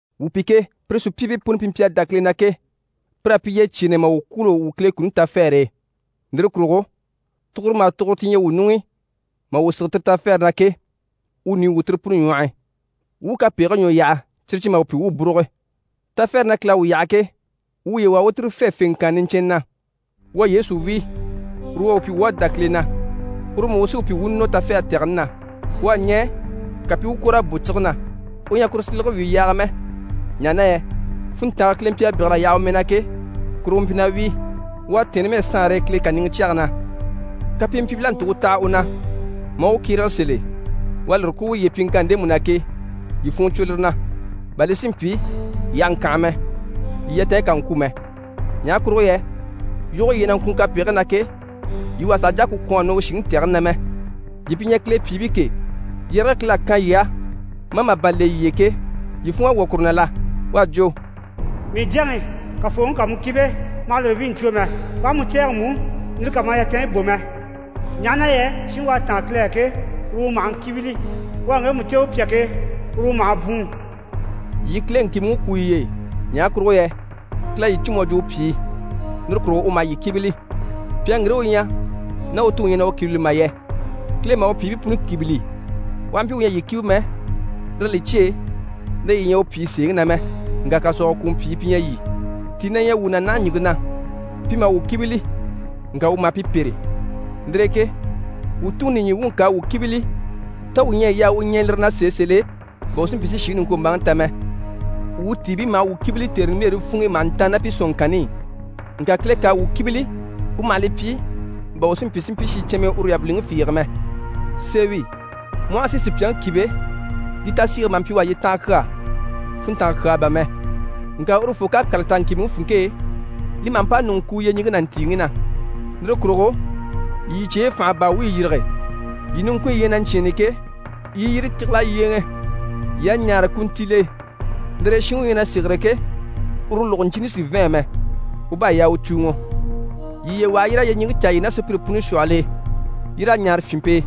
Wuu pi ke, pire sùpyiibii puni pi mpyi a dá Kile na ke, pir'à pyi yyecyeenɛ maa wuu kwûulo, wuu Kile kuni tafɛɛre e. Lire kurugo tuguro maha tuguro ti ɲyɛ wuu ɲuŋ'i maa wuu sige tire tafɛɛre na ke, wuu ɲùɲyi wwû tire puni ɲwɔh'i, wuu u kapegigii ɲwɔ yaha, cyire cyi maha wuu pyi wuu u búruge. Tafɛɛre na Kile à wuu yaha ke, wuu wuye waha wuu u tire fê fèŋkanna niɲcɛnnɛ na. Wuu a Yesu wíi, uru u à wuu pyi wuu à dá Kile na, uru mú u sí wuu pyi wuu u nɔ tɛgɛni na. U à ɲɛɛ, ka pi i u kwòr'a bò cige na. U ɲyɛ a kuru silege wíi yaaga mɛ, ɲaha na yɛ funntange Kile mpyi a bégel'a yaha u mɛɛ na ke, kuru u mpyi na wíi. U à tɛ̀ɛn numɛ saanre e Kile kàniŋɛ cyɛge na. Kapimpyiibil'à ntùŋke taha u na maa u kyérege sèl'e, u à lire kwú uye e pyiŋkanni ndemu na ke, yii funŋɔ cwo lire na, bà li si mpyi yii àha ŋkànha mɛ, yii yatanɲyi kà ŋkwû mɛ. Ɲaha kurugo yɛ yoge yii ɲyɛ na ŋkwùun kapegigii na ke, yii wà sàha jà a ku kwɔ̀n a nɔ u shìŋi tɛgɛni na mɛ. Yii pi ɲyɛ Kile pyìibii ke, yɛrɛge Kile à kan yii á maa màban le yii e ke, yii funŋ'à wwɔ̀ kuru na la? U à jwo: «Mii jyaŋi, Kafooŋi ká mu kíbe, ma hà lire wíi ɲcwo mɛ. U aha mu cɛ̂ɛgɛ mú, lire kà ma yatanɲyi bò mɛ. Ɲaha na yɛ shinŋi u à táan Kile á ke, uru u maha ŋkíbili. U à ŋgemu cè u pyà ke, uru u maha bwùun.» Yii Kile ŋkìbiŋi kwû yiye e, ɲaha kurugo yɛ Kile à yii cû mu à jwo u pyìi, lire kurugo u maha yii kíbili. Pyàŋi ŋgire u ɲyɛ ná u tuŋi ɲyɛ na u kíbili mà yɛ? Kile maha u pyìibii puni kíbili. U aha mpyi u ɲyɛ a yii kíbe mɛ, lir'à li cyêe na yii ɲyɛ u pyìi sèeŋi na mɛ, ŋka kàsɔɔgɔ kùŋɔ pyìi pi ɲyɛ yii. Tii na ɲyɛ wuu na naha ɲìŋke na, pi maha wuu kíbili, ŋka wuu maha pi pêre. Lire e ke wuu Tuŋi nìɲyi wuŋi ká a wuu kíbili, tá wuu ɲyɛ a yaa wuu ɲɛɛ lire na sèe sèl'e, bà wuu si mpyi si shìŋi niŋkwombaaŋi ta mɛ? Wuu tiibii maha wuu kíbili tère nimbilere funŋ'i maha ntàanna ná pi sɔ̀nŋɔŋkanni i. Ŋka Kile ká a wuu kíbili, u maha li pyi, bà wuu si mpyi si mpyi shincɛnmii uru yabiliŋi fiige mɛ. Sèe wi, mu aha a si sùpyaŋi kíbe, li tasiige maha mpyi u á yyetanha kyaa, funntanga kyaa bà mɛ. Ŋka urufoo ká kàla ta ŋkìbiŋi funŋke e, li maha mpa ɲùŋɔ kuu yyeɲiŋke ná ntìiŋi na. Lire kurugo yii yii cyeyi fànha baa wuyi yîrige, yii niŋkunɲyi yi ɲyɛ na ɲcyɛ̂ɛnni ke, yii i yire tígil'a yyéeŋɛ. «Yii a ɲaare kuntiile e.» Lire e shinŋi u ɲyɛ na sêgere ke, uru lògoɲcini sì n‑fɛ̂ɛn mɛ, u bá a yaa u cùuŋɔ. Yii yiye waha yii raa yyeɲiŋke caa yii ná sùpyire puni shwɔhɔl'e. Yii raa ɲaare fyìnmpe e,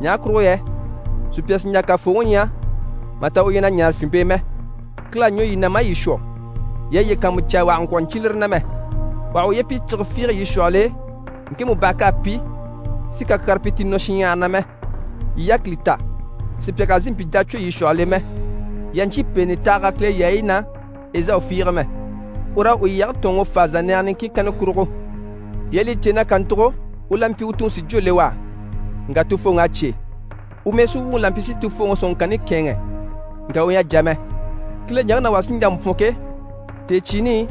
ɲaha kurugo yɛ sùpya sì n‑jà Kafooŋi ɲya mà ta u ɲyɛ na ɲaare fyìnmpe e mɛ. Kile à ɲwɔ yii na maa yii shwɔ. Yii a yiye kàanmucaa, wà kà ŋkwɔ̀ ɲcyé lire na mɛ. Wà hà uye pyi cige fiige yii shwɔhɔl'e ŋkemu bàha k'à pi, si kakyaare pyi ti nɔ shinɲyahara na mɛ. Yii yákili ta, sùpya kà zìi mpyi jacwɔ yii shwɔhɔl'e mɛ. Yii àha ɲcyé pèenɛ tahaga Kile yaayi na Ezawu fiige mɛ. Ur'à u lyɛge tɔ̀ɔnŋi fáa zànnɛɛgɛ niŋkin kanna kurugo. Yii à li cè na kàntugo, u la mpyi u tuŋi si jwó le u á, ŋka tufooŋ'à cyé. U mɛɛsuwuŋi la mpyi si tufooŋi sɔ̀nŋɔŋkanni kɛ̂ɛnŋɛ, ŋka u ɲyɛ a jà mɛ. Kile ɲaŋke na wà sí n‑jà n‑bwɔ̀n ke, tèecyiini i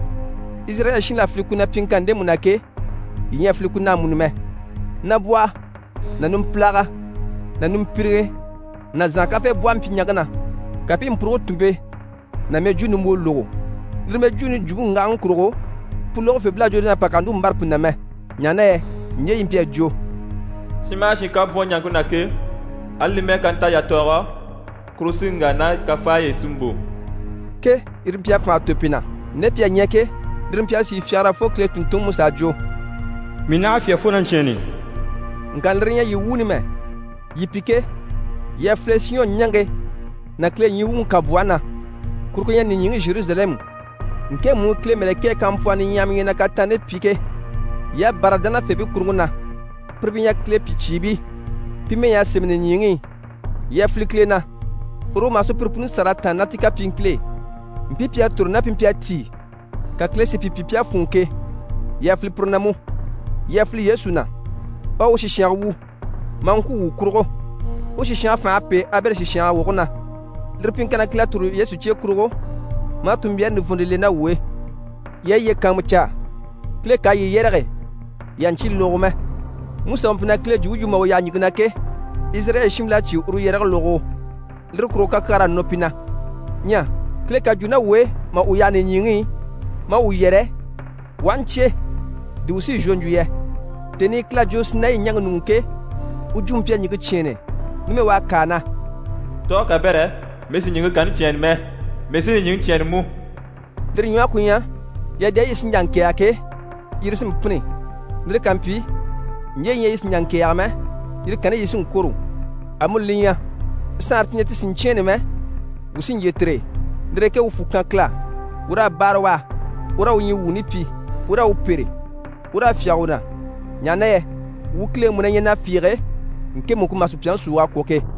Izirayɛli shiinbil'à file ku na pyiŋkanni ndemu na ke, yii ɲyɛ a file Kile na amuni mɛ. Nabwɔhɔ ná numpilaga ná nimpiriŋɛ ná zànha kafeebwɔhɔ mpyi ɲaŋke na, ka pi i mpuruge tùnmpe ná mɛjwuu nimbwoo lógo. Lire mɛjwuuni jwumpe ŋgahaŋi kurugo, pu lógofeebil'à jwo na pà kà núru mbâra pu na mɛ. Ɲaha na yɛ ɲje yi mpyi a jwo: «Shin maha shin ká bwɔ̀n ɲaŋke na ke, ali li mɛ́ɛ ká nta yatɔɔgɔ, kuru sí n‑wà ná kafaayi i si mbò ke» yire mpyi a fànha tò pi na. Nde pi à ɲya ke, lire mpyi a sìi fyagara fo Kile tùnntunŋiMusa à jwo: «Mii naha fyá fo na ɲcyɛ̂ɛnni!» Ŋka lire ɲyɛ yii wuuni mɛ. Yii pi ke, yii à file Siyɔn ɲaŋke ná Kile ɲyii wuŋi kànbwɔhe na, kuru ku ɲyɛ nìɲyiŋi Zheruzalɛmu, ŋkemu i Kile mɛ̀lɛkɛɛ kampwɔhii niɲyahaɲyahamii ɲyɛ na kataanni pyi ke. Yii à bâra dánafeebii kuruŋke na, pire pi ɲyɛ Kile pyìcyiibii. Pi mɛy'à sémɛ nìɲyiŋi i. Yii à file Kile na, uru u maha sùpyire puni sâra a tàanna ná ti kapyiiŋkil'e. Mpii pi à toro ná pi mpyi a tíi, ka Kile si pi pyi pi à fûnŋɔ ke, yii à file pire na mú. Yii à file Yesu na. U à u sìshange wu, maa ŋkwû wuu kurugo. U sìshange fành'à pêe Abɛli sìshange woge na. Lire pyiŋkanni na, Kile à tòro Yesu cye kurugo, maa tunmbyaare nivɔnnte le ná wuu e. Yii a yiye kàanmucaa, Kile ká a yii yɛrɛge, yii àha ɲcyé logogo mɛ. Musa u mpyi na Kile jwumpe yu mà u yaha ɲìŋke na ke, Izirayɛli shiinbil'à cyé uru yɛrɛge logogo, lire kurugo kakyaar'à nɔ pi na. Ɲyɛ Kile ká jwo ná wuu e mà u yaha nìɲyiŋi i maa wuu yɛrɛ, wuu aha ɲcyé, di wuu sí n‑shwɔ n‑jwo yɛ? Tèni i Kile à jwo Sinayi ɲaŋke ɲuŋ'i ke, u jwumpe mpyi a ɲìŋke cyɛ̂ɛnnɛ. Numɛ, u à kâa na: «Tɔɔge kabɛrɛ, mii sì ɲìŋke kanni cyɛ̂ɛnnɛ mɛ, mii sí nìɲyiŋi cyɛ̂ɛnnɛ mú.» Lire ɲwɔhe ku ɲyɛ, yadayi yi sí n‑jà n‑kɛ̀ɛgɛ ke, yire sí n‑pînni. Lire ká mpyi, ɲje yi ɲyɛ yi sì n‑jà n‑kɛ̀ɛgɛ mɛ, yire kanni yi sí n‑kwôro. Amuni li ɲyɛ, saanre ti ɲyɛ ti sì n‑cyɛ̂ɛnnɛ mɛ, wuu sí n‑jyè tire e. Lire e ke wuu fwù kan Kile á, wuu raa báare u á, wuu raa u ɲyii wuuni pyi, wuu raa u pêre, wuu raa fyáge u na. Ɲaha na yɛ «wuu Kile mú na ɲyɛ na fiige, ŋkemu ku maha sùpyaŋi súug'a kwɔ̀ ke.»